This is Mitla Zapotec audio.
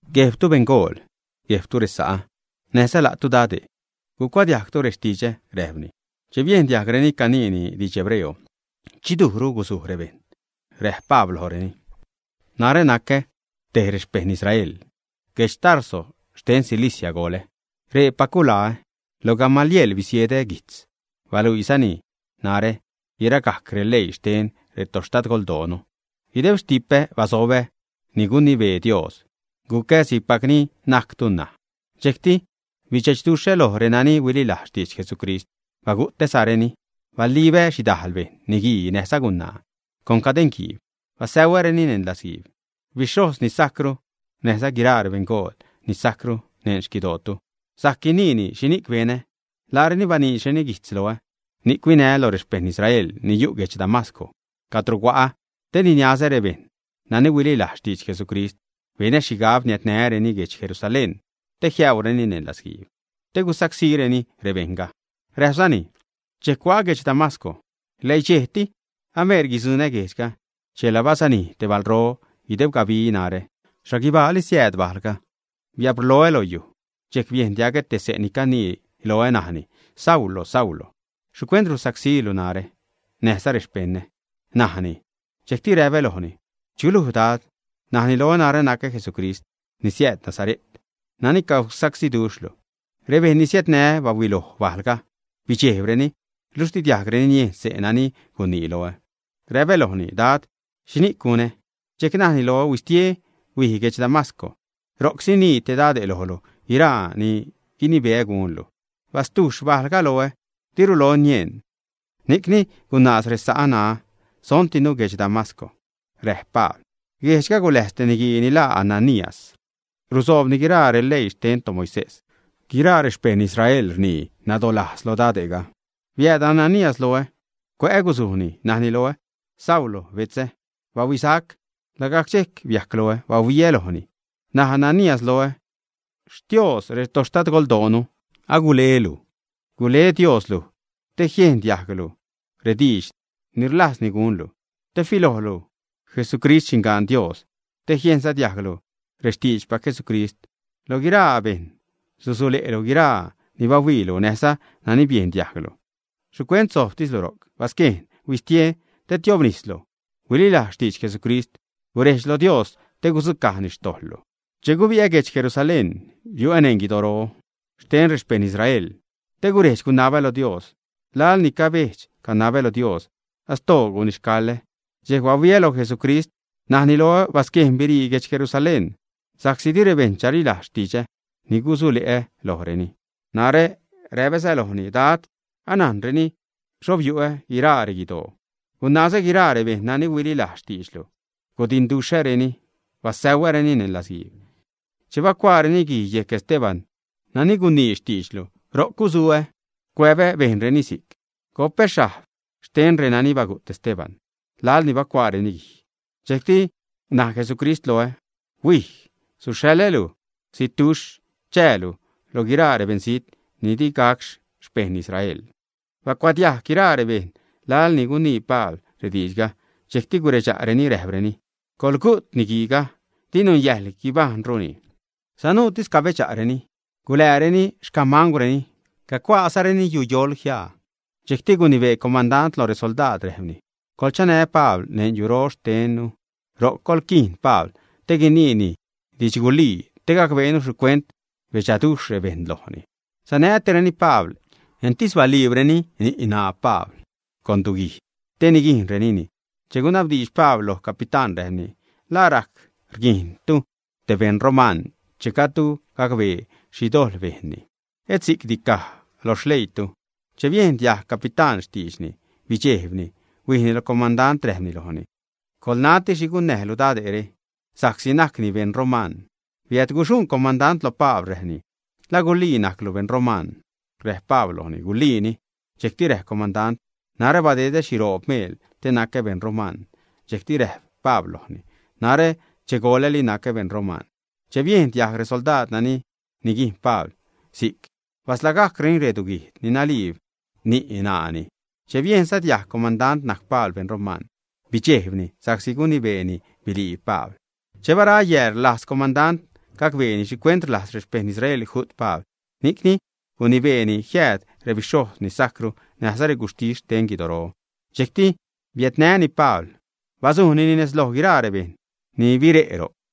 ―Guejbtu beṉgool, guejbtu resa'ä, näjza la'tu dade'. Gucuadiajgtu rextidxä ―räjpni. Che biejn diajgreni caniini didx hebreo, dxidujru guzuj rebejṉ. Räjp Pabl lojreni: ―Narä nacä te xpejṉ Israel. Guedx Tarso xten Cilicia goḻä. Reepac gulaä. Lo Gamaliel bisiedä guijtz. Baluisa'cni narä guiragajc releii xten retoxtadgoldoonu. Guideb xtipä basobä ni gunibee Dios. Gucä si'cpac ni najctu ṉaj. Dxejcti bidxechduxhä loj renani huililajz xtidx Jesucrist, bagu'täzareni. Balibä xhidajl bejṉ, niguii näjza gunaa, con cadeṉguiib. Basäuäreni neṉ latzguiib. Bixhojz ni sajcru näjza guiraa rebeṉgool ni sajcru neṉ xquidootu, sajc guinii xhini'c benä. Laareni baniidxreni guijtz loä. Ni'c huinää lo rexpejṉ Israel ni yu' guedx Damasco, cadro hua'a te niniazä rebejṉ nani huililajz xtidx Jesucrist. Benä xhigab jiädnää́reni guedx Jerusalén te jiäureni neṉ latzguiib, te gusacsíreni rebejṉga. Räjpzani: ―Dxejc hua'a guedx Damasco. Läidxejti ameer guidzuṉä guejdxga, chela bazanij te balro guideb gabi narä. Xhaguibaali siääd bajlga. Biabrloä lo yuj, dxejc biejn diagä te se' ni canii loä, najni: “Saulo, Saulo, ¿xhicuent rusacsílu narä näjza rexpeṉä?” najni. Dxejcti räpä lojni: “¿Chuluj, Dad?” Najni loä: “Narä nacä Jesucrist ni siääd Nasare't, nani cagusacsíduxhlu.” Rebejṉ ni sanää́ bahuiloj bajlga, bidxejbreni, niluxh di diajgreni niejn xse' nani gunii loä. Räpä lojni: “Dad, ¿xhini'c gunä?” Dxejcti najni loä: “Huistie, huij guedx Damasco. Ro'c sinii te dade' lojlu guiraa ni guinibeä gunlu.” Bastujxh bajlga loä, diru loä nieṉ, ni'cni gunaaz resa'ä ṉaä, sontinu guedx Damasco. Räjp Pabl: ―Guejdxga guläjz te niguii ni laa Ananías. Rusoobni guiraa releii xten toMoisés. Guiraa rexpejṉ Israel rnii nadalajz lo dade'ga. Biääd Ananías loä. Cuä'ä guzujni najni loä: “¡Saulo, betzä, bahuisac!” Lagajc dxejc biajc loä, bahuiä lojni. Naj Ananías loä: “Xtios retoxtadgoldoonu agulelu. Gule Dios luj te jiejn diajglu rediidx ni rlajzni gunlu, te filojlu Jesucrist, Xindxan Dios, te jiejnza diajglu rextiidxpac Jesucrist. Loj guiraa bejṉ susule'lu guiraa ni bahuiilu näjza nani biejn diajglu. ¿Xhicuent sojbtislu ro'c? Basquejn, huistie te tiobnislu. Huililajz xtidx Jesucrist, gurejdx lo Dios te gudzucajni rextojḻlu.” ’Che gubi'ä guedx Jerusalén, biu'ä neṉ guidoro xten rexpejṉ Israel te guredx-gunabä lo Dios. Laḻ ni cabedx-canabä lo Dios, astoo gunixcaḻä, dxejc bahuiä lo Jesucrist. Najni loä: “Basquejn, birii guedx Jerusalén sa'csi di rebejṉ chalilajz xtidxä ni gusule'lu lojreni.” Narä räpäza lojni: “Dad, anajnreni xho biu'ä guiraa reguidoo, gunazä guiraa rebejṉ nani huililajz xtiidxlu, gudinduxhäreni, basäuäreni neṉ latzguiib. Che bacuaareni guij yejc Esteban nani gunii xtiidxlu, ro'c guzuä, cuäbä bejnreni si'c. Go'pä xhajb xten renani bagu't Esteban laḻ ni bacuaareni guij.” Dxejcti naj Jesucrist loä: “Huij. Suxhaḻä luj zitduxh. Chäälu lo guiraa rebeṉzijt ni di gac xpejṉ Israel.” Bacuadiajg guiraa rebejṉ laḻ ni gunii Pabl rediidxga, dxejcti guredxa'reni, räjpreni: ―Coḻgu't niguiiga. Di nunyäjḻ guibajṉruni. Sanuutis cabedxa'reni. Gulääreni xcamangwreni, cacuaazareni yuyoḻ jiaa. Dxejcti gunibee comandant lo resoldaad, räjpni: ―Coḻchanä Pabl neṉ yuro xtennu. Ro'c coḻquiin Pabl te guiniini didxgulii, te gacbeenu xhicuent rbedxaduxh rebejṉ lojni. Sanätireni Pabl. Entis baliibreni ni', ṉaa Pabl con duguijd te niguijnrenini che gunabdiidx Pabl lo capitán, räjpni: ―¿La rajc rguijntu te beṉ roman che gajdtu gacbee xhi dojḻ bejnni, ä? Et si'cti caj lo xleiilu. Che biejn diajg capitán xtiidxni, bidxejbni, huijni lo comandant, räjpni lojni: ―Coḻnati xhi gunnäjlu dade're, sa'csi najcni beṉ roman. Biädguxuṉ comandant lo Pabl, räjpni: ―¿La gulii najclu beṉ roman, ä? Räjp Pabl lojni: ―Guliini. Dxejcti räjp comandant: ―Narä badedä xhiroob meel te nacä beṉ roman. Dxejcti räjp Pabl lojni: ―Narä che goḻäli nacä beṉ roman. Che biejn diajg resoldaad nani niguijn Pabl si'c, basḻagajcreni reduguijd ni naliib ni', ṉaani. Che biejnza diajg comandant najc Pabl beṉ roman, bidxejbni sa'csi gunibeeni biliib Pabl. Che bara yääl, rlajz comandant gacbeeni xhicuent rlajz rexpejṉ Israel ju't Pabl. Ni'c gunibeeni jiääd rebixhojz ni sajcru näjza reguxhtis xten guidoro. Dxejcti biädnäni Pabl, bazujnini nez loj guiraa rebejṉ ni bire' ro'c.